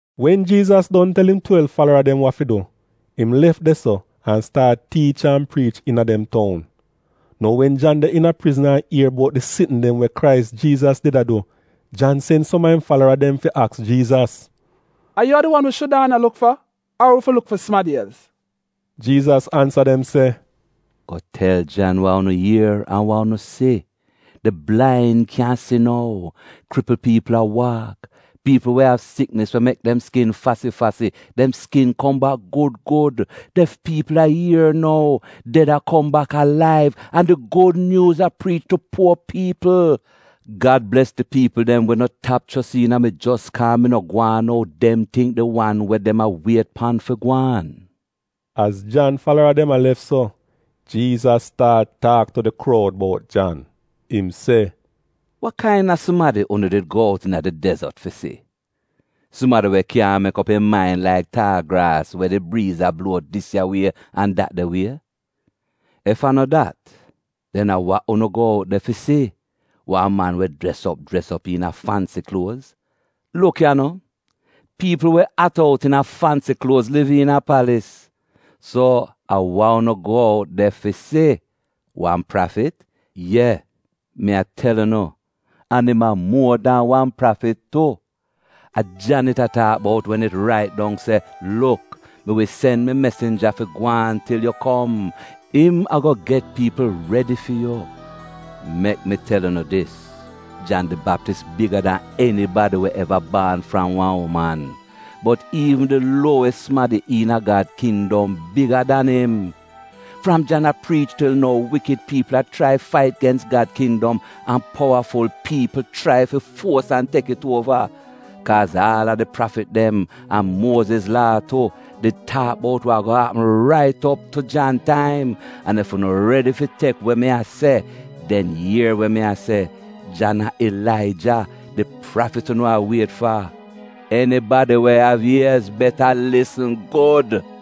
Wen Jiizas don tel im twelv falara dem wa fi du, im lef de-so an staat tiich an priich iina dem toun. Nou wen Jan de iina prizn an ier bout di sitn dem we Krais Jiizas did a du. Jan sen som a im falara dem fi aks Jiizas, “A yu a di wan wi shudaana luk fa? Ar wi fi luk fi sumadi els?” Jiizas ansa dem se, “Go tel Jan wa unu ier an wa unu si: Di blain kyan si nou; kripl piipl a waak; piipl we av siknis we mek dem skin fasi-fasi, dem skin kom bak gud gud, def piipl a ier nou, ded a kom bak alaiv, an di gud nyuuz a priich tu puo piipl. Gad bles di piipl dem we no tap chos iina mi jos kaa mi no gwaan ou dem tingk di wan we dem a wiet pan fi gwaan.” Az Jan falara dem a lef so, Jiizas staat taak tu di kroud bout Jan. Im se, “Wa kaina sumadi unu did go out iina di dezot fi si? Sumadi we kyaahn mek op im main laik taal graas we di briiz a bluo dis ya wie an dat de wie? Ef a no dat, den a wa unu go out de fi si? Wan man we jres op jres op iina fansi kluoz? Luk ya no, piipl we at out iina fansi kluoz liv iina palis. So a wa unu go out de fi si? Wan prafit? Ye, mi a tel unu, an im a muo dan wan prafit tu. A Jan it a taak bout wen it rait dong se: “‘Luk, mi wi sen mi mesinja fi gwaan til yu kom, im ago get piipl redi fi yu.’ Mek mi tel unu dis, Jan di Baptis biga dan enibadi we eva baan fram wan uman. Bot iivn di luowis sumadi iina Gad kindom, biga dan im.” Fram Jan a priich til nou, wikid piipl a chrai fait gens Gad kindom an powaful piipl chrai fi fuos an tek it uova. Kaaz aal a di prafit dem, an Muoziz Laa tu, did taak bout wa ago apm rait op tu Jan taim. An ef unu redi fi tek we mi a se, den ier we mi a se, Jan a Ilaija, di prafit unu a wiet fa. Enibadi we av iez — beta lisn gud!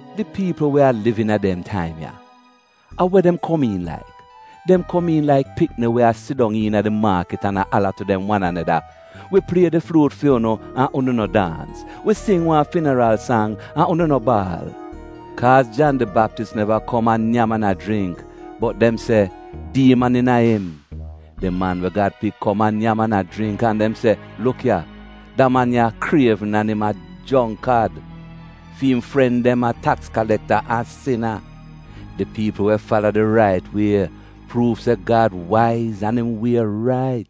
“Di piipl we a liv iina dem taim ya, a we dem komiin laik? Dem komiin laik pikni we a sidong iina di maakit an a ala tu dem wan aneda, “‘Wi plie di fluut fu'unu, an unu no daans: wi sing wan finaral sang, an unu no baal.’ Kaaz Jan di Baptis neva kom a nyam an a jringk, bot dem se, ‘Diiman iina im.’ Di Man we Gad Pik kom a nyam an a jringk, an dem se, ‘Luk ya, da man ya krievn an im a jongkad. Fi im fren dem a taks kalekta an sina!’ Di piipl we fala di rait wie pruuv se Gad waiz an im wie rait.”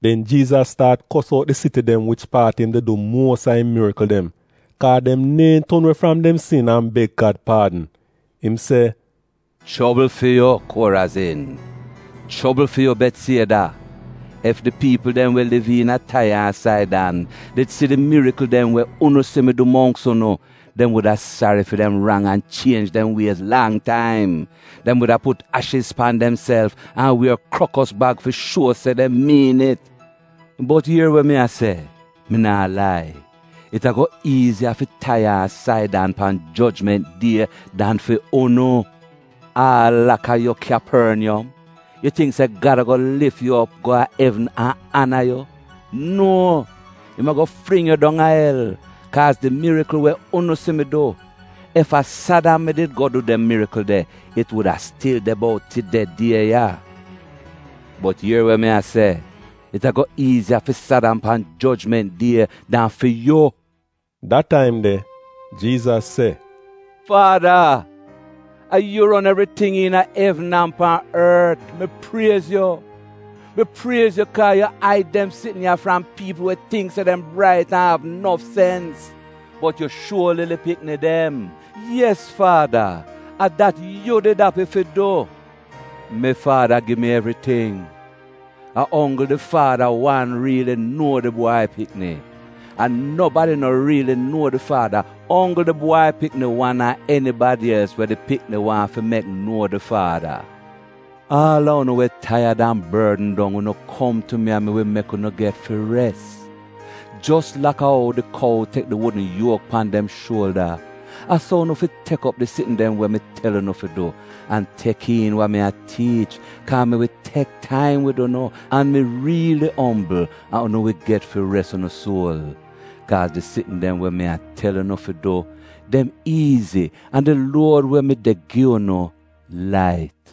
Den Jiizas staat kos out di siti dem wich paat im did du muos a im mirikl dem, kaa dem neehn ton we fram dem sin an beg Gad paadn. Im se, “Chobl fi yu, Korazin! Chobl fi yu Betsieda! Ef di piipl dem we liv iina Taiya an Saidan did si di mirikl dem we unu si mi du mongks unu, dem wuda sari fi dem rang an chienj dem wiez lang taim. Dem wuda put ashiz pan demself an wier krokos bag fi shuo se dem miin it. Bot ier we mi a se, mi naa lai: it ago iiziya fi Taiya an Saidan pan jojment die dan fi unu. Aal laka yu Kyaporniyom, yu tingk se Gad ago lif yu op go a evn an ana yu? Nuo, im ago fling yu dong a el. Kaaz di mirikl we unu si mi du, ef a Sadam mi did go du dem mirikl de, it wuda stil de bout tide die ya. Bot ier we mi a se, it ago iiziya fi Sadam pan jojment die dan fi yu!” Da taim de, Jiizas se, “Faada, a yu ron evriting iina evn an pan ort, mi priez yu. Mi priez yu kaa yu aid dem sitn ya fram piipl we tingk se dem brait an av nof sens, bot yu shuo lili pikni dem. Yes Faada, a dat yu did api fi du. “Mi Faada gi mi evriting. A onggl di Faada wan riili nuo di Bwai Pikni. An nobadi no riili nuo di Faada, onggl di Bwai Pikni wan an enibadi els we di pikni waahn fi mek nuo di Faada. “Aal a unu we taiyad an bordn dong unu kom tu mi an mi wi mek unu get fi res. Jos laka ou di kou tek di wudn yuok pan dem shuolda, a so unu fi tek op di sitn dem we mi tel unu fi du, an tek iin wa mi a tiich, kaa mi wi tek taim wid unu, an mi riili ombl, an unu wi get fi res unu suol. Kaaz di sitn dem we mi a tel unu fi du, dem iizi an di luod we mi de gi unu — lait.